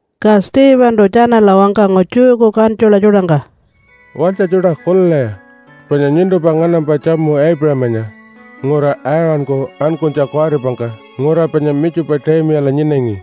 Ka Stephentu tjanala wangkangu Jewku kantjula tjuṯangka, “Walytja tjuṯa kulilaya! Panya nyuntumpa nganampa tjamu Aipuṟamanya ngura Aaṟanku ankunytja kuwaripangka ngura panya Mitjupu-taimiyala nyinangi.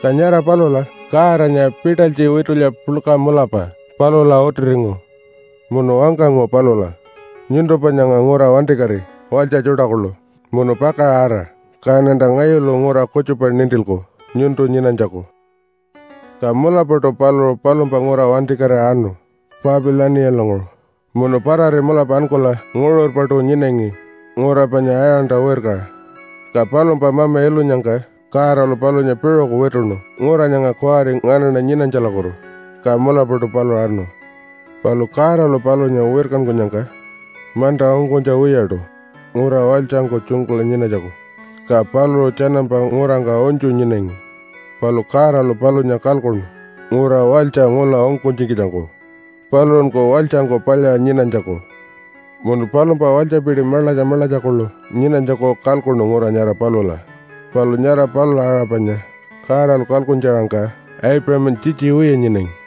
Ka nyara palula Godanya pitalytji witulya puḻka mulapa palula utiringu. Munu wangkangu palula, ‘Nyuntumpa nyanga ngura wantikati walytja tjuṯa kuḻu, munu pakaṟa ara kaṉanta ngayulu ngura kutjupa nintilku nyuntu nyinanytjaku.’ “Ka mulapaṯu paluṟu palumpa ngura wantikatira anu Papilaniyalanguṟu, munu parari mulapa ankula nguṟurpaṯu nyinangi ngura panya Aaṟanta wirkaṟa. Ka palumpa mama ilunyangka Godalu palunya piṟuku wituṉu ngura nyanga kuwari nganaṉa nyinanytjalakutu. Ka mulapaṯu paluṟu anu. Palu Godalu palunya wirkankunyangka manta ungkunytja wiyaṯu ngura walytjangku tjunkula nyinanytjaku, ka paluṟu tjanampa ngurangka unytju nyinangi. Palu Godalu palunya kalkuṉu ngura walytja ngula ungkunytjikitjangku paluṟunku walytjangku palyaṟa nyinanytjaku. Munu palumpa walytjapiti maḻatja maḻatja kuḻu nyinanytjaku kalkuṉu ngura nyara palula. Palu nyara palula aṟa panya Godalu kalkuntja-aṟangka Aipuṟamanya tjitji wiya nyinangi.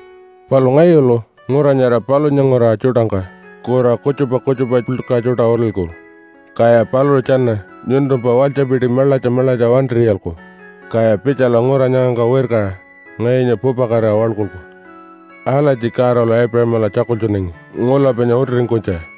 Palu ngayulu ngura nyara palunya nguraṟa tjuṯangka kura kutjupa kutjupa puḻka tjuṯa utilku, kaya paluṟu tjana nyuntumpa walytjapiti maḻatja maḻatja wantir'iyalku, kaya pitjala ngura nyangangka wirkaṟa ngayunya pupakatira waḻkulku.’ Alatji Godalu Aipuṟamala tjakultjunangi ngula panya utiringkunytja.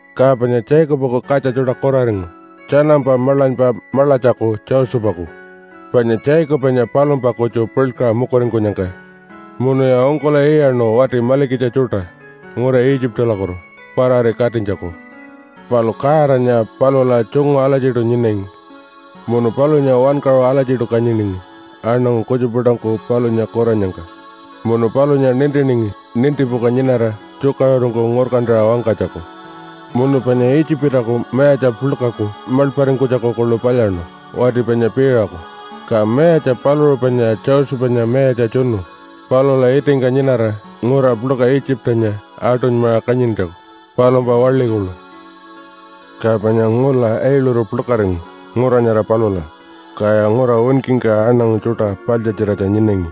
“Ka panya Jacobaku katja tjuṯa kuraringu tjanampa maḻanypa maḻatjaku Josephaku, panya Jacobanya palumpa kutju puḻkaṟa mukuringkunyangka. Munuya ungkul'iyaṉu wati malikitja tjuṯa ngura Itjipalakutu parari katinytjaku. Palu Godanya palula tjungu alatjiṯu nyinangi. Munu palunya wankaṟu alatjiṯu kanyiningi aṉangu kutjupa tjuṯangku palunya kurannyangka. Munu palunya nintiningi nintipuka nyinara tjukaṟurungku ngurkantaṟa wangkanytjaku. Munu panya Itjipaku mayatja puḻkaku maḻparingkunytjaku kuḻu palyaṉu, wati panya Piiṟaku. Ka mayatja paluṟu panya Josephanya mayatja tjunu palula itingka nyinara ngura puḻka Itjipanya aṯunymaṟa kanyintjaku, palumpa waḻi kuḻu. “Ka panya ngula ailuru puḻkaringu ngura nyara palula, kaya ngura winkingka aṉangu tjuṯa paḻtjatjiratja nyinangi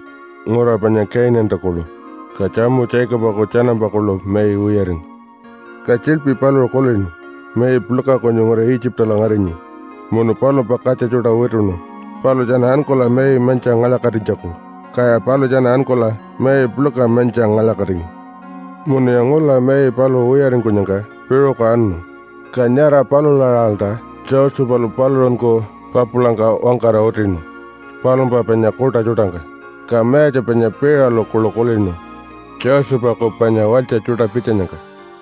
ngura panya Kainanta kuḻu. Ka tjamu Jacobaku tjanampa kuḻu mai wiyaringu. Ka tjiḻpi paluṟu kulinu mai puḻka kunyu ngura Itjipala ngarinyi, munu palumpa katja tjuṯa wituṉu paluṟu tjana ankula mai mantjiṟa ngalya-katinytjaku. Kaya paluṟu tjana ankula mai puḻka mantjiṟa ngalya-katingu. Munuya ngula mai paluṟu wiyaringkunyangka piṟuku anu, ka nyara palula-aṟalta Josephalu paluṟunku papulangka wangkara utinu palumpa panya kuṯa tjuṯangka. Ka mayatja panya Piiṟalu kuḻu kulinu Josephaku panya walytja tjuṯa pitjanyangka.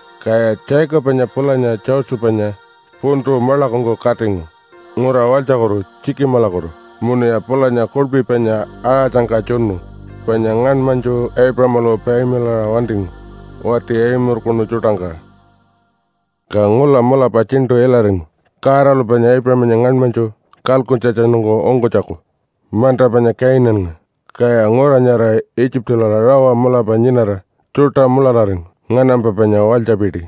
Kaya Jacobanya pulanya Josephanya puntu maḻakungku katingu ngura walytjakutu Tjikimalakutu munuya pulanya kuḻpi panya aṟatjangka tjunu, panya ngaṉmanytju Aipuṟamalu payamilaṟa wantingu wati Aimurkunu tjuṯangka. “Ka ngula mulapa tjiṉṯu ilaringu Godalu panya Aipuṟamanya ngaṉmanytju kalkuntjatjanungku ungkunytjaku manta panya Kainannga. Kaya ngura nyara Itjipala rawa mulapa nyinara tjuṯa mulararingu, nganampa panya walytjapiti.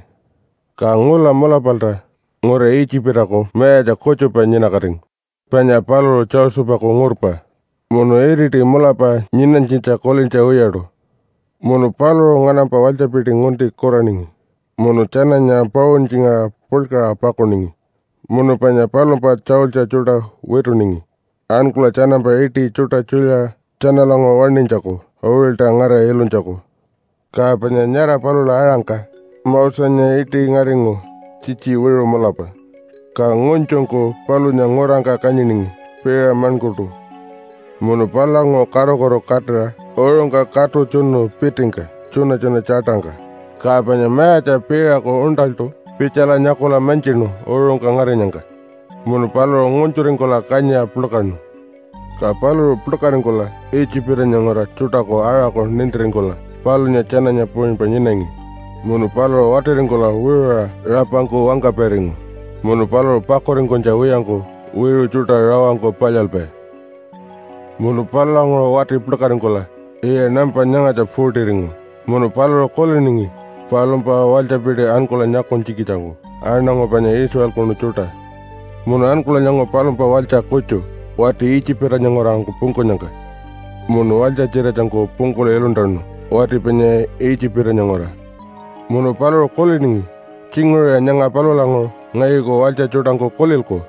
Ka ngula mulapalta ngura Itjipaku mayatja kutjupa nyinakatingu panya paluṟu Josephaku ngurpa munu iriti mulapa nyinanytjitja kulintja wiyaṯu. Munu paluṟu nganampa walytjapiti ngunti kuraningi munu tjananya pauntjingaṟa puḻkaṟa pakuningi. Munu panya palumpa tjaultji tjuṯa wituningi ankula tjanampa iṯi tjuṯa tjulyaṟa tjanalanguṟu waṉinytjaku uṟilta ngarira ilunytjaku. “Ka panya nyara palula aṟangka Mosenya iṯi ngaringu tjitji wiṟu mulapa, ka ngunytjungku palunya ngurangka kanyiningi piṟa maṉkurtu. Munu palulanguṟu karukutu katira uṟungka katu tjunu pitingka tjuṉa-tjuṉa tjaṯangka, ka panya mayatja Piiṟaku uṉṯaltu pitjala nyakula mantjinu uṟungka ngarinyangka munu paluṟu ngunytjuringkula kanyiṟa puḻkaṉu. Ka paluṟu puḻkaringkula Itjipanya nguraṟa tjuṯaku aṟaku nintiringkula palunya tjananya puṟunypa nyinangi. Munu paluṟu watiringkula wiṟuṟa rapangku wangkapairingu, munu paluṟu pakuringkunytja wiyangku wiṟu tjuṯa rawangku palyalpai. “Munu palulanguṟu wati puḻkaringkula yiya nampa nyangatja 40-ringu, munu paluṟu kuliningi palumpa walytjapiti ankula nyakunytjikitjangku aṉangu panya Israelkunu tjuṯa. Munu ankula nyangu palumpa walytja kutju wati Itjipanya nguraṟangku pungkunyangka munu walytja-tjiratjangku pungkula iluntanu wati panya Itjipanya nguraṟa. Munu paluṟu kuliningi, ‘Tjinguṟuya nyanga palulanguṟu ngayuku walytja tjuṯangku kulilku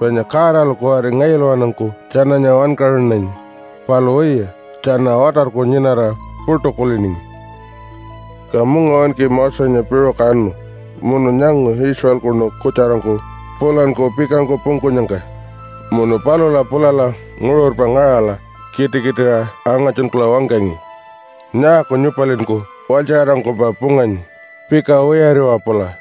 panya Godalu kuwari ngayulawanungku tjananya wankaṟunanyi.’ Palu wiya, tjana watarku nyinara puṯu kuliningi. “Ka mungawinki Mosenya piṟuku anu munu nyangu Israelkunu kutjarangku pulanku pikangku pungkunyangka. Munu palula pulala nguṟurpa ngaṟala kitikitiṟa angatjunkula wangkangi, ‘Nyaaku nyupalinku walytjaṟarangkumpa punganyi? Pika wiyariwa pula!’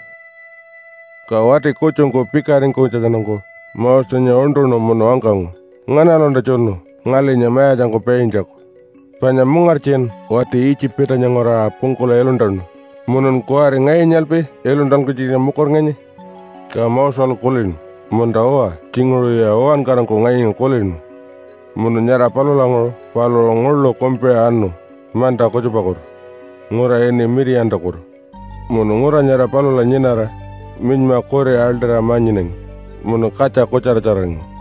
“Ka wati kutjungku pikaringkunytjatjanungku Mosenya uṉṯuṉu munu wangkangu, ‘Nganalunta tjunu ngalinya mayatjangku paintjaku? Panya mungartjin wati Itjipanya nguraṟa pungkula iluntanu, munun kuwari ngayunyalpi iluntankunytjikitja mukuringanyi?’ Ka Moselu kulinu, ‘Munta-uwa, tjinguṟuya uwankarangku ngayunya kulinu.’ Munu nyara palulanguṟu paluṟu nguḻu kumpiṟa anu manta kutjupakutu ngura ini Mitiyantakutu munu ngura nyara palula nyinara minyma kuri aḻṯira ma-nyinangi, munu katja kutjaratjararingu.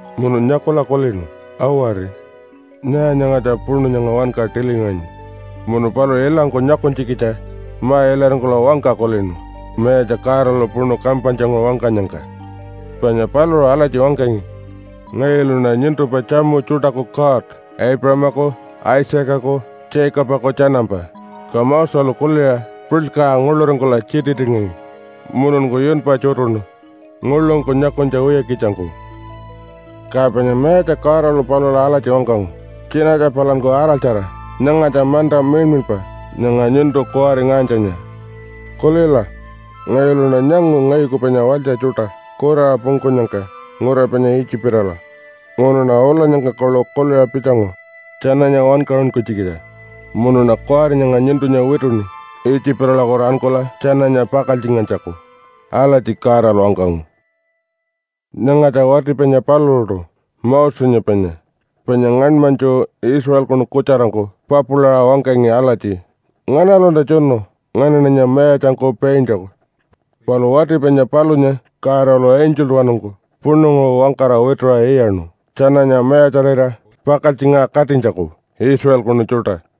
Munu nyakula kulinu, ‘Awari! Nyaa nyangatja puṉu nyanga wanka tilingaṟanyi.’ Munu paluṟu ilangku nyakunytjikitja ma-ilaringkula wangka kulinu Mayatja Godalu puṉu kampanytjanguṟu wangkanyangka. Panya paluṟu alatji wangkangi, ‘Ngayuluṉa nyuntumpa tjamu tjuṯaku God, Aipuṟamaku Isaacaku Jacobaku tjanampa.’ Ka Moselu kuliṟa puḻkaṟa nguḻuringkula tjititingangi mununku yunpa tjutuṉu nguḻungku nyakunytja wiyakitjangku. “Ka panya Mayatja Godalu palula alatji wangkangu, ‘Tjinatja palanku araltjara! Nyangatja manta miḻmiḻpa nyanga nyuntu kuwari ngaṟanytjanya. Kulila! Ngayuluṉa nyangu ngayuku panya walytja tjuṯa kuraṟa pungkunyangka ngura panya Itjipala, munuṉa ulanyangka kuḻu kuliṟa pitjangu tjananya wankaṟunkunytjikitja. Munuṉa kuwari nyanga nyuntunya wituṉi Itjipalakutu ankula tjananya pakaltjingantjaku.’ Alatji Godalu wangkangu. “Nyangatja wati panya paluṟuṯu Mosenya panya, panya ngaṉmanytju Israelkunu kutjarangku papulaṟa wangkangi alatji, ‘Nganalunta tjunu nganaṉanya mayatjangku paintjaku?’ Palu wati panya palunya Godalu angeltawanungku puṉunguṟu wangkara wituṟa iyaṉu tjananya mayatjarira pakaltjingaṟa katinytjaku Israelkunu tjuṯa.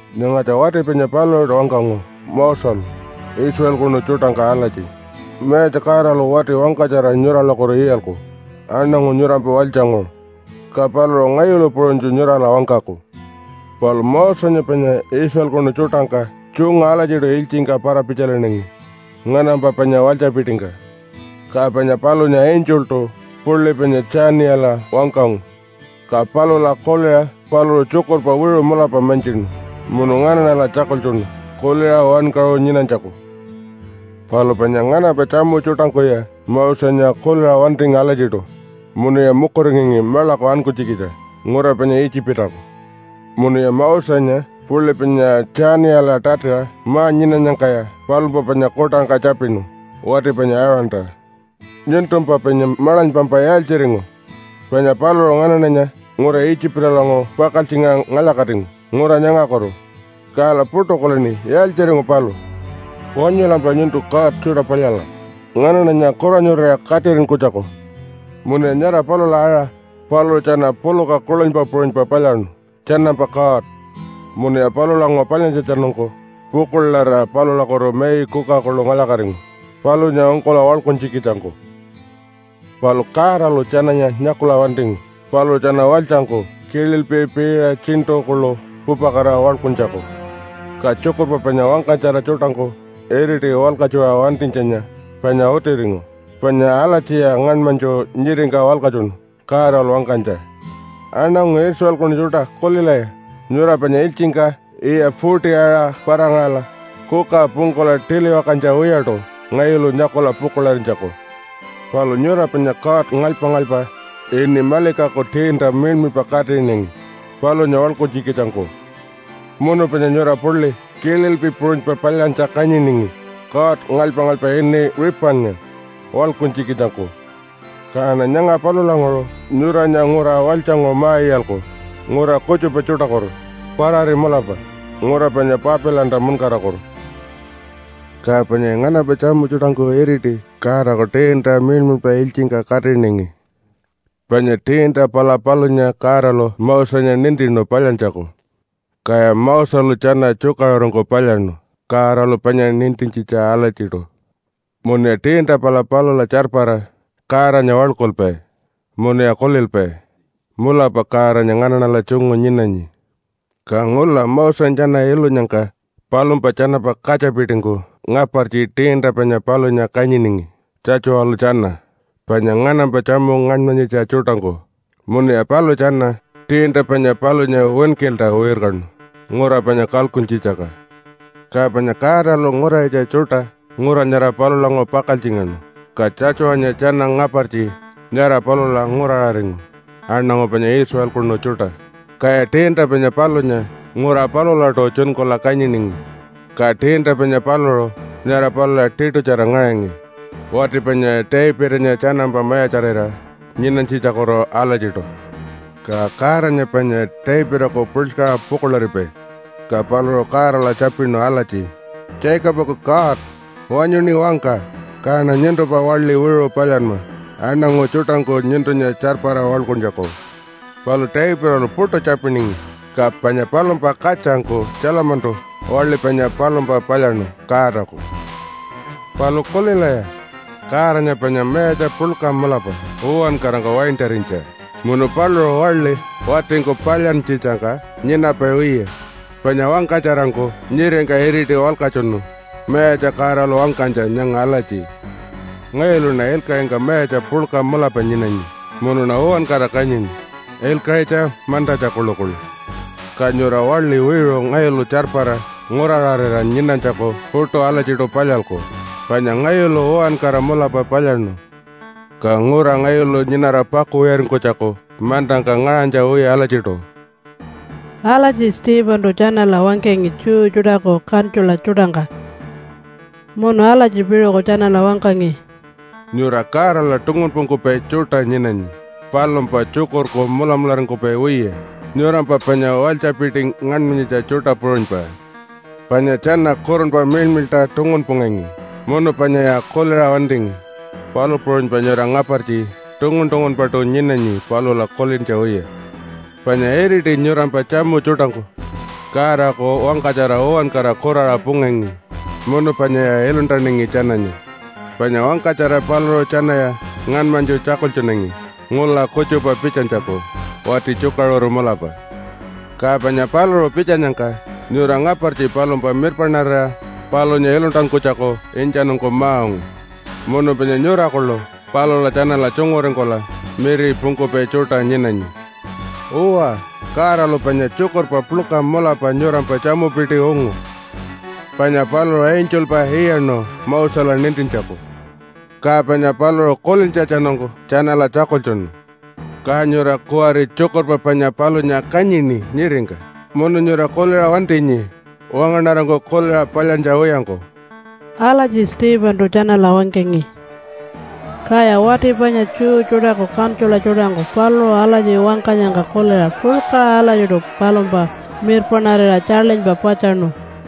“Nyangatja wati panya paluṟuṯu wangkangu Moselu Israelkunu tjuṯangka alatji, ‘Mayatja Godalu wati wangkatjara nyuralakutu iyalku aṉangu nyurampa walytjanguṟu, ka paluṟu ngayulu puṟunytju nyurala wangkaku.’ Palu Mosenya panya Israelkunu tjuṯangka tjungu alatjiṯu ilytjingka para-pitjalinangi nganampa panya walytjapitingka. Ka panya palunya angeltu puḻi panya Tjaniyala wangkangu, ka palula kuliṟa paluṟu tjukurpa wiṟu mulapa mantjinu munu nganaṉala tjakultjunu kuliṟa wankaṟu nyinanytjaku. “Palu panya nganampa tjamu tjuṯangkuya Mosenya kuliṟa wantingi alatjiṯu munuya mukuringangi maḻaku ankunytjikitja ngura panya Itjipaku. Munuya Mosenya puḻi panya Tjaniyala tatiṟa ma-nyinanyangkaya palumpa panya kuṯangka tjapinu wati panya Aaronta, ‘Nyuntumpa panya maḻanypampa yaaltjiringu? Panya paluṟu nganaṉanya ngura Itjipalanguṟu pakaltjingaṟa ngalya-katingu ngura nyangakutu. Kala puṯu kulini yaaltjiringu paluṟu. Wanyulampa nyuntu god tjuṯa palyala nganaṉanya kuranyurira katiṟinkunytjaku.’ Munuya nyara palula aṟa paluṟu tjana puluka kuḻunypa puṟunypa palyaṉu tjanampa god. Munuya palulanguṟu palyantjatjanungku pukuḻarira palulakutu mai kuka kuḻu ngalya-katingu palunya ungkula waḻkuntjikitjangku. “Palu Godalu tjananya nyakula wantingu paluṟu tjana walytjangku kililpi piṟa tjiṉṯu kuḻu pupakatira waḻkuntjaku. Ka tjukurpa panya wangkatjara tjuṯangku iriti walkatjuṟa wantinytjanya panya utiringu, panya alatjiya ngaṉmanytju nyiringka walkatjunu Godalu wangkanytja, ‘Aṉangu Israelkunu tjuṯa, kulilaya! Nyura panya ilytjingka yiya 40-aṟa para-ngaṟala kuka pungkula tiliwakantja wiyaṯu ngayulu nyakula pukuḻarinytjaku. Palu nyura panya god ngalypa-ngalypa ini Malikaku tiinta miḻmiḻpa katiṟinangi palunya waḻkuntjikitjangku. Munu panya nyura puḻi kililpi puṟunypa palyantja kanyiningi god ngalypa-ngalypa ini Ripannga waḻkuntjikitjangku. Kaṉa nyanga palulanguṟu nyuranya ngura walytjanguṟu ma-iyalku ngura kutjupa tjuṯakutu parari mulapa ngura panya Papilanta munkarakutu.’ “Ka panyaya nganampa tjamu tjuṯangku iriti Godaku tiinta miḻmiḻpa ilytjingka katiṟinangi. Panya tiinta pala palunya Godalu Mosenya nintinu palyantjaku, kaya Moselu tjana tjukaṟurungku palyaṉu Godalu panya nintintjitja alatjiṯu. Munuya tiinta pala palula tjarpara Godanya waḻkulpai munuya kulilpai, ‘Mulapa Godanya nganaṉala tjungu nyinanyi.’ Ka ngula Mosenya tjana ilunyangka palumpa tjanampa katjapitingku ngapartji tiinta panya palunya kanyiningi Tjatjuwalu tjana panya nganampa tjamu ngaṉmanyitja tjuṯangku. Munuya paluṟu tjana tiinta panya palunya winkilta wirkanu ngura panya kalkuntjitjangka. Ka panya Godalu nguraṟitja tjuṯa ngura nyara palulanguṟu pakaltjingaṉu ka Tjatjuwanya tjana ngapartji nyara palula nguraṟaringu aṉangu panya Israelkunu tjuṯa. Kaya tiinta panya palunya ngura palulaṯu tjunkula kanyiningi, ka tiinta panya paluṟu nyara palula tiṯutjara ngaṟangi wati panya Davidanya tjanampa mayatjarira nyinanytjitjakutu alatjiṯu. Ka Godanya panya Davidaku puḻkaṟa pukuḻaripai. Ka paluṟu Godala tjapinu alatji, ‘Jacobaku God! Wanyuṉi wangka, kaṉa nyuntumpa waḻi wiṟu palyanma aṉangu tjuṯangku nyuntunya tjarpara waḻkuntjaku.’ Palu Davidalu puṯu tjapiningi, ka panya palumpa katjangku Tjalamantu waḻi panya palumpa palyaṉu Godaku. “Palu kulilaya! Godanya panya mayatja puḻka mulapa uwankarangka waintarinytja munu paluṟu waḻi watingku palyantjitjangka nyinapai wiya. Panya wangkatjarangku nyiringka iriti walkatjunu Mayatja Godalu wangkanytja nyanga alatji, ‘Ngayuluṉa ilkaṟingka mayatja puḻka mulapa nyinanyi, munuṉa uwankara kanyini, ilkaṟitja mantatja kuḻukuḻu. Ka nyura waḻi wiṟu ngayulu tjarpara nguraṟarira nyinanytjaku puṯu alatjiṯu palyalku. Panya ngayulu uwankara mulapa palyaṉu. Ka ngura ngayulu nyinara pakuwiyaringkunytjaku mantangka ngaṟanytja wiya alatjiṯu.’” Alatji Stephentu tjanala wangkangi Jew tjuṯaku kantjula tjuṯangka. Munu alatji piṟuku tjanala wangkangi, “Nyura Godala tungunpungkupai tjuṯa nyinanyi palumpa tjukurku mulamularingkupai wiya nyurampa panya walytjapiti ngaṉmanyitja tjuṯa puṟunypa. Panya tjana Kurunpa Miḻmiḻṯa tungunpungangi munu panyaya kuliṟa wantingi, palu puṟunypa nyura ngapartji tungun-tungunpaṯu nyinanyi palula kulintja wiya. Panya iriti nyurampa tjamu tjuṯangku Godaku wangkatjara uwankara kuraṟa pungangi munu panyaya iluntanangi tjananya. Panya wangkatjara paluṟu tjanaya ngaṉmanytju tjakultjunangi ngula kutjupa pitjanytjaku wati tjukaṟuru mulapa. Ka panya paluṟu pitjanyangka nyura ngapartji palumpa mirpaṉarira palunya iluntankunytjaku intjanungku ma-ungu. Munu panya nyura kuḻu palula tjanala tjunguringkula miripungkupai tjuṯa nyinanyi. Uwa, Godalu panya tjukurpa puḻka mulapa nyurampa tjamupiti ungu, panya paluṟu angelpa iyaṉu Mosela nintintjaku, ka panya paluṟu kulintjatjanungku tjanala tjakultjunu. Ka nyura kuwari tjukurpa panya palunya kanyini nyiringka, munu nyura kuliṟa wantinyi wangaṉarangku kuliṟa palyantja wiyangku.” Alatji Stephentu tjanala wangkangi. Kaya wati panya Jew tjuṯaku kantjula tjuṯangku paluṟu alatji wangkanyangka kuliṟa puḻkaṟa alatjiṯu palumpa mirpaṉarira tjaḻinypa patjaṉu.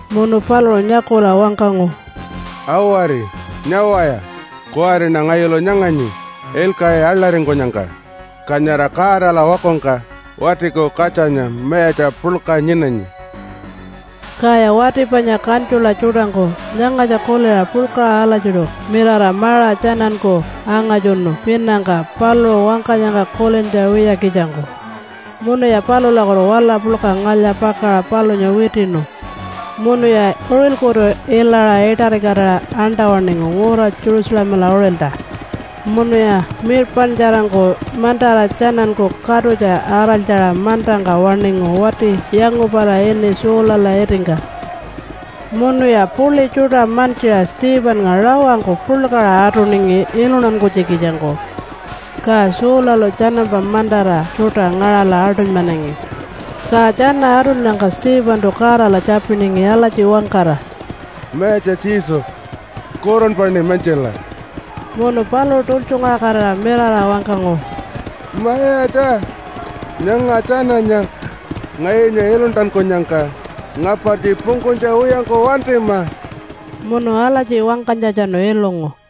Munu paluṟu nyakula wangkangu, “Awari! Nyawaya! Kuwariṉa ngayulu nyanganyi ilkaṟi aḻaringkunyangka, ka nyara Godala wakungka Watiku Katjanya mayatja puḻka nyinanyi.” Kaya wati panya kantjula tjuṯangku nyangatja kuliṟa puḻkaṟa alatjiṯu mirara maṟa tjananku angatjunu pinangka paluṟu wangkanyangka kulintja wiyakitjangku, munuya palulakutu wala puḻka ngalya-pakaṟa palunya witiṉu. Munuya uṟilkutu ilaṟa iṯarikatira aṉṯa-waṉingu ngura Jerusalemala uṟilta, munuya mirpaṉtjarangku mantara tjananku katutja araltjaṟa mantangka waṉingu wati yangupala ini Saulala itingka. Munuya puḻi tjuṯa mantjiṟa Stephennga rawangku puḻkaṟa atuningi iluntankunytjikitjangku. Ka Saulalu tjanampa mantara tjuṯa ngaṟala aṯunymanangi. Ka tjana atunnyangka Stephentu Godala tjapiningi alatji wangkara, “Mayatja Jesu, Kurunpaṉi mantjila!” Munu paluṟu tultjungaṟakatira mirara wangkangu, “Mayatja! Nyanga tjananya ngayunya iluntankunyangka ngapartji pungkunytja wiyangku wantima!” Munu alatji wangkanytjatjanu ilungu.